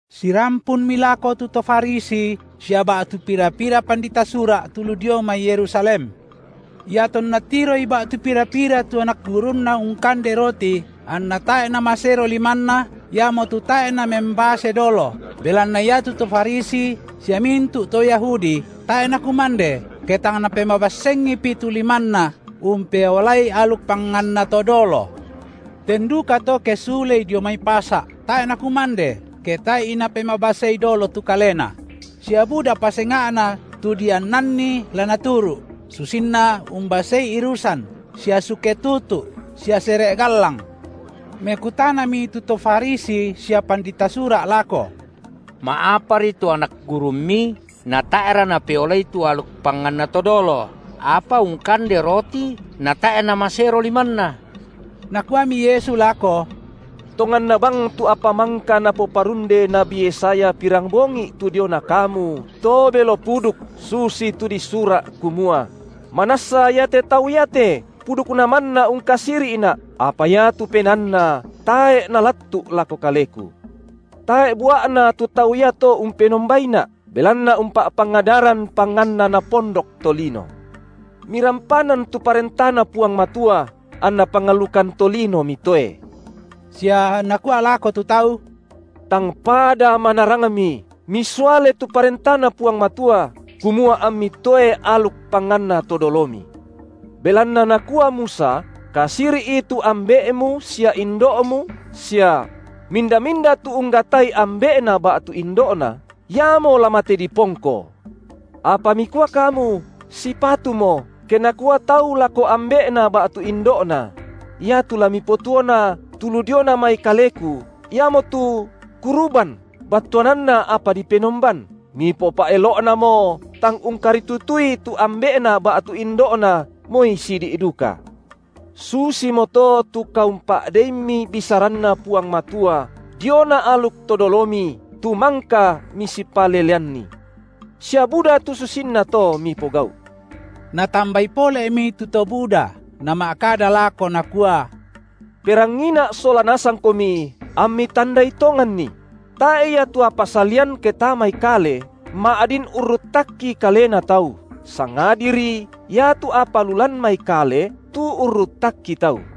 Sirampunmi lako tu to Farisi sia ba’tu pira-pira pandita Sura’ tu lu dio mai Yerusalem. Iatonna tiroi ba’tu pira-pira tu anak gurunNa ungkande roti anna tae’ namasero limanna, iamotu tae’ namembase dolo, belanna iatu to Farisi sia mintu’ to Yahudi tae’ nakumande, ke tang napemabassengipi tu limanna, umpeolai aluk panganna to dolo. Ten dukato ke sulei dio mai pasa’, tae’ nakumande, ke tae’i napemabasei dolo tu kalena; sia budapa senga’na tu diannanni la naturu’, susinna umbasei irusan sia suke tutu’ sia sere’ gallang. Mekutanami tu to Farisi sia pandita Sura’ lako: Ma’apari tu anak gurumMi natae’ra napeolai tu aluk panganna to dolo, apa ungkande roti natae’ namasero limanna? Nakuami Yesu lako: Tonganna bang tu apa mangka napoparunde nabi Yesaya pirambongi’ tu diona kamu, to belo puduk, susitu disura’, kumua: Manassa iate tau iate pudukna manna ungkasiri’Na’ apa iatu penaanna tae’ nalattu’ lako Kaleku. Tae’ bua’na tu tau iato umpenombaiNa’, belanna umpa’pangadaran panganna napondok tolino. Mirampanan tu ParentaNa Puang Matua, anna pangalukan tolino mitoe. Sia Nakua lako tu tau: Tangpada manarangmi misuale tu ParentaNa Puang Matua, kumua ammi toe aluk panganna to dolomi. Belanna nakua Musa: Kasiri’i tu ambe’mu sia indo’mu sia: Minda-minda tu unggatai ambe’na ba’tu indo’na, iamo la mate dipongko. Apa mikua kamu: Sipatumo, ke nakua tau lako ambe’na ba’tu indo’na: Iatu la mipotuona tu lu diona mai kaleku, iamotu kuruban battuananna apa dipenomban, mipopa’elo’namo tang ungkaritutui tu ambe’na ba’tu indo’na moi sidi’ duka. Susimoto tu kaumpa’deimmi bisaranNa Puang Matua diona aluk to dolomi tu mangka misipaleleanni. Sia buda tu susinna to mipogau’. Natambai pole’mi tu to buda, nama’kada lako Nakua: Perangiina’ sola nasangkomi ammi tandai tonganni! Tae’ ia tu apa salian ke tamai kale, ma’din urruttakki kalena tau, sangadiri iatu apa lu lan mai kale, tu urruttakki tau.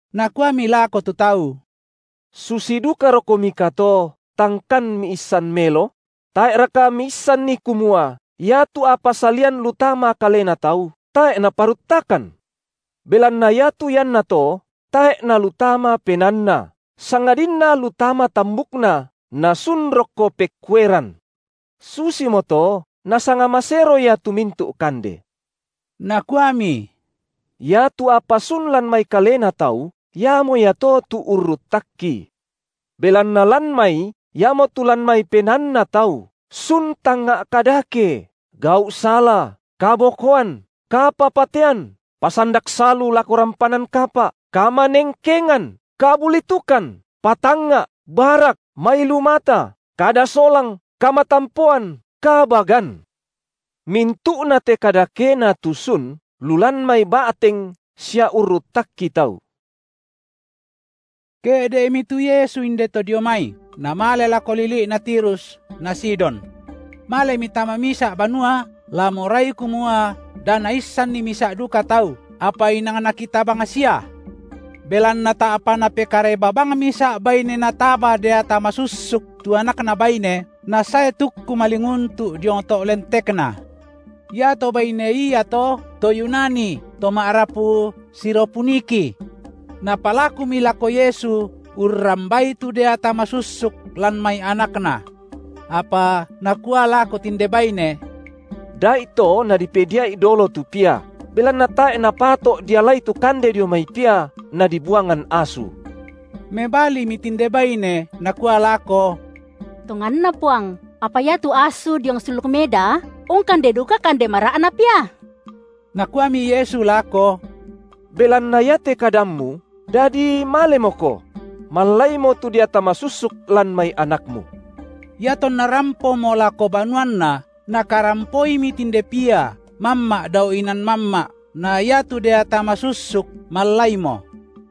Nakuami lako tu tau: Susi dukarokomika to, tangkan miissan melo? Tae’raka miissanni kumua iatu apa salian lu tama kalena tau, tae’ naparuttakan? Belanna iatu iannato tae’ nalu tama penaanna, sangadinna lu tama tambukna, na sun rokko pekkueran. Susimoto Nasanga masero ia tu mintu’ kande. Nakuami: Iatu apa sun lan mai kalena tau, iamo iato tu urruttakki. Belanna lan mai, iamotu lan mai penaanna tau, sun tangnga’ kadake, gau’ sala, kabokoan, kapapatean, pasandak salu lako rampanan kapa’, kamanengkengan, kabulitukan, patangnga’, barak, mailu mata, kada solang, kamatampoan, kabagan. Mintu’nate kadakena tu sun lu lan mai ba’teng sia urruttakki tau. Ke’de’mi tu Yesu indeto dio mai, Namale lako lili’na Tirus na Sidon. Malemi tama misa’ banua, la morai kumua da naissanni misa’ duka tau, apa inang nakita bang sia. Belanna ta’pa napekareba bang misa’ baine nataba deata masussuk tu anakna baine, nasae tukku malinguntu’ diong to’ lentekNa. Iato baine iato to Yunani to ma’rapu Siro-Puniki. Napalakumi lako Yesu urrambai tu deata masussuk lan mai anakna. Apa Nakua lako tinde baine: Da’ito nadipedia’i dolo tu pia, belanna tae’ napato’ dialai tu kande dio mai pia nadibuangan asu. Mebalimi tinde baine nakua lako: Tonganna Puang, apa iatu asu diong sulluk meda ungkande duka kande mara’na pia. Nakuami Yesu lako: Belanna iate kadammu, dadi malemoko; mallaimo tu deata masussuk lan mai anakmu. Iatonna rampomo lako banuanna, nakarampoimi tinde pia mamma’ dao inan mamma’ na iatu deata masussuk mallaimo.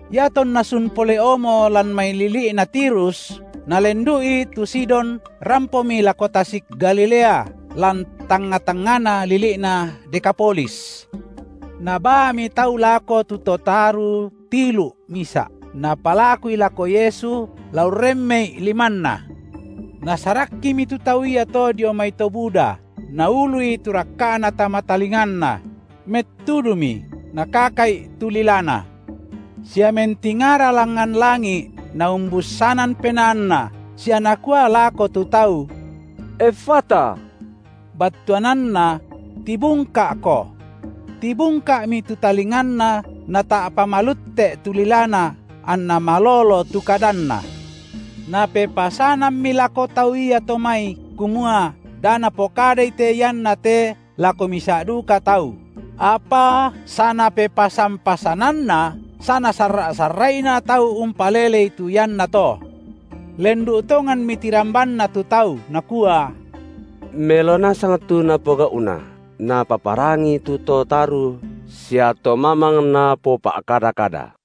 Iatonna sun pole’omo lan mai lili’na Tirus, Nalendu’i tu Sidon rampomi lako tasik Galilea lan tangnga-tangngana lili’na Dekapolis. Nabaami tau lako tu to taru tilu’ misa’, napalakui lako Yesu la urremmei’ limanNa. Nasarakkimi tu tau iato dio mai to buda, Naului tu rakka’Na tama talinganna; mettuduMi Nakaka’i tu lilana. Sia mentingara langngan langi’ Naumbussanan penaanNa sia Nakua lako tu tau: Effata, battuananna: Tibungka’ko. Tibungka’mi tu talinganna nata’pa malutte’ tu lilana anna malolo tu kadanna. Napepasanammi lako tau iato mai, kumua da napokadai te ianna te lako misa’ duka tau; apa sia Napepasan-pasananna sanasarra’-sarra’ina tau umpalelei tu iannato. Lendu’ tonganmi tirambanna tu tau nakua: Melo nasang tu Napogau’na Napaparangi tu to taru sia to mamang Napopa’kada-kada.